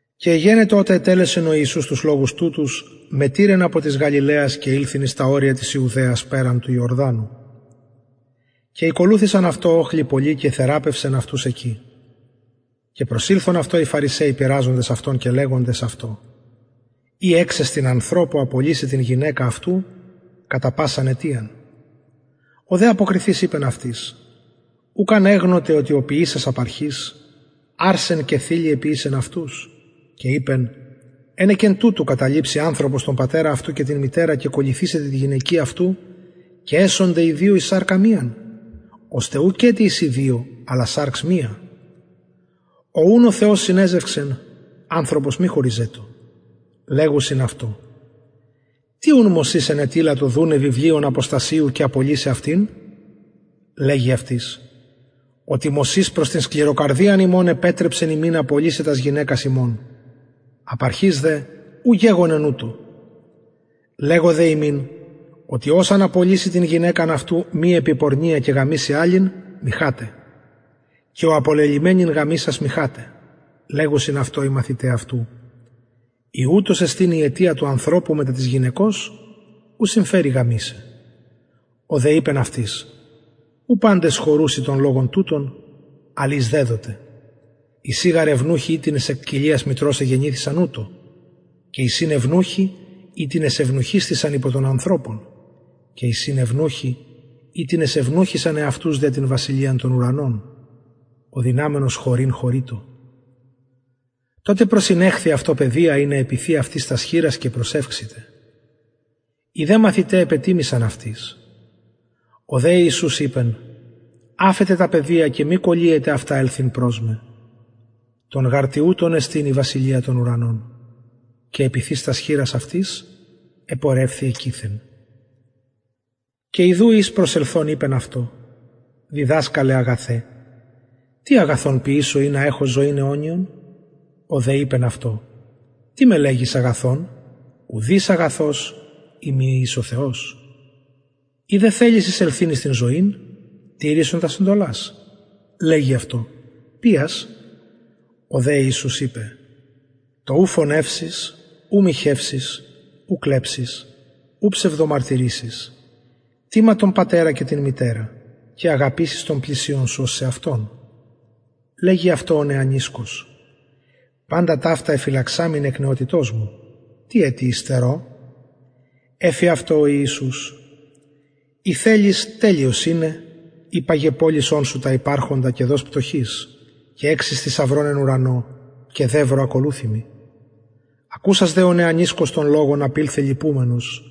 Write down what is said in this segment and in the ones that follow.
και εγενετο οτε ετελεσεν ο ιησους τους λογους τουτους μετηρεν απο της γαλιλαιας και ηλθεν εις τα ορια της ιουδαιας περαν του ιορδανου και ηκολουθησαν αυτω οχλοι πολλοι και εθεραπευσεν αυτους εκει και προσηλθον αυτω οι φαρισαιοι πειραζοντες αυτον και λεγοντες αυτω ει εξεστιν ανθρωπω απολυσαι την γυναικα αυτου κατα πασαν αιτιαν ο δε αποκριθεις ειπεν αυτοις ουκ ανεγνωτε οτι ο ποιησας απ αρχης αρσεν και θηλυ εποιησεν αυτους και ειπεν ενεκεν τουτου καταλειψει ανθρωπος τον πατερα και την μητερα και προσκολληθησεται τη γυναικι αυτου και εσονται οι δυο εις σαρκα μιαν ωστε ουκετι εισιν δυο αλλα σαρξ μια ο ουν ο θεος συνεζευξεν ανθρωπος μη χωριζετω λεγουσιν αυτω τι ουν μωσης ενετειλατο δουναι βιβλιον αποστασιου και απολυσαι αυτην λεγει αυτοις οτι μωσης προς την σκληροκαρδιαν υμων επετρεψεν υμιν απολυσαι τας γυναικας υμων απ αρχης δε ου γεγονεν ουτως λεγω δε υμιν οτι ος αν απολυση την γυναικα αυτου μη επι πορνεια και γαμηση αλλην μοιχαται και ο απολελυμενην γαμησας μοιχαται λεγουσιν αυτω οι μαθηται αυτου ει ουτως εστιν η αιτια του ανθρωπου μετα της γυναικος ου συμφερει γαμησαι ο δε ειπεν αυτοις ου παντες χωρουσιν τον λογον τουτον αλλ οις δεδοται εισιν γαρ ευνουχοι οιτινες εκ κοιλιας μητρος εγεννηθησαν ουτως και εισιν ευνουχοι οιτινες ευνουχισθησαν υπο των ανθρωπων και εισιν ευνουχοι οιτινες ευνουχισαν εαυτους δια την βασιλειαν των ουρανων ο δυναμενος χωρειν χωρειτω τοτε προσηνεχθη αυτω παιδια ινα τας χειρας επιθη αυτοις και προσευξηται οι δε μαθηται επετιμησαν αυτοις ο δε ιησους ειπεν αφετε τα παιδια και μη κωλυετε αυτα ελθειν προς με των γαρ τοιουτων εστιν η βασιλεια των ουρανων και επιθεις αυτοις τας χειρας επορευθη εκειθεν και ιδου εις προσελθων ειπεν αυτω διδασκαλε αγαθε τι αγαθον ποιησω ινα εχω ζωην αιωνιον ο δε ειπεν αυτω τι με λεγεις αγαθον ουδεις αγαθος ει μη εις ο θεος ει δε θελεις εισελθειν εις την ζωην τηρησον τας εντολας λεγει αυτω ποιας ο δε ιησους ειπεν το ου φονευσεις ου μοιχευσεις ου κλεψεις ου ψευδομαρτυρησεις τιμα τον πατερα και την μητερα και αγαπησεις τον πλησιον σου ως σεαυτον λεγει αυτω ο νεανισκος παντα ταυτα εφυλαξαμην εκ νεοτητος μου τι ετι υστερω εφη αυτω ο ιησους ει θελεις τελειος ειναι υπαγε πωλησον σου τα υπαρχοντα και δος πτωχοις και εξεις θησαυρον εν ουρανω και δευρο ακολουθει μοι ακουσας δε ο νεανισκος τον λογον απηλθεν λυπουμενος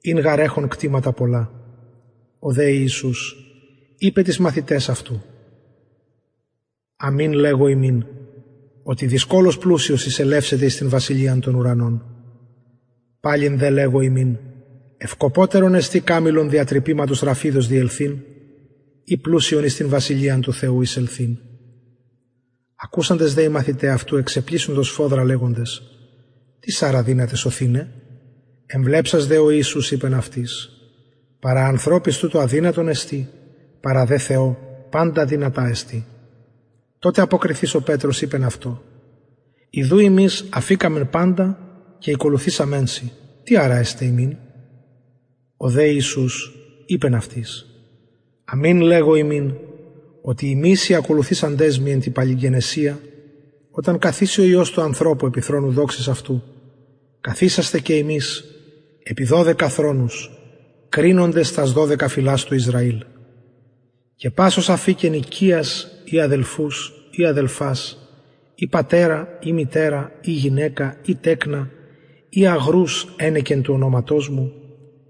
ην γαρ εχων κτηματα πολλα ο δε ιησους ειπεν τοις μαθηταις αυτου αμην λεγω υμιν οτι δυσκολως πλουσιος εισελευσεται εις την βασιλειαν των ουρανων παλιν δε λεγω υμιν ευκοπωτερον εστιν καμηλον δια τρυπηματος ραφιδος διελθειν η πλουσιον εις την βασιλειαν του θεου εισελθειν ακουσαντες δε οι μαθηται αυτου εξεπλησσοντο σφοδρα λεγοντες τις αρα δυναται σωθηναι εμβλεψας δε ο ιησους ειπεν αυτοις παρα ανθρωποις τουτο αδυνατον εστιν παρα δε θεω παντα δυνατα τοτε αποκριθεις ο πετρος ειπεν αυτω ιδου ημεις αφηκαμεν παντα και ηκολουθησαμεν σοι τι αρα εσται ημιν ο δε ιησους ειπεν αυτοις αμην λεγω υμιν οτι υμεις οι ακολουθησαντες μοι εν τη παλιγγενεσια οταν καθιση ο υιος του ανθρωπου επι θρονου δοξης αυτου καθισεσθε και υμεις επι δωδεκα θρονους κρινοντες τας δωδεκα φυλας του ισραηλ και πας ος αφηκεν οικιας η αδελφους η αδελφας η πατερα η μητερα η γυναικα η τεκνα η αγρους ενεκεν του ονοματος μου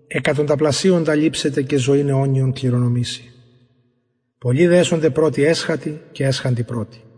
εκατονταπλασιονα ληψεται και ζωην αιωνιον κληρονομησει πολλοι δε εσονται πρωτοι εσχατοι και εσχατοι πρωτοι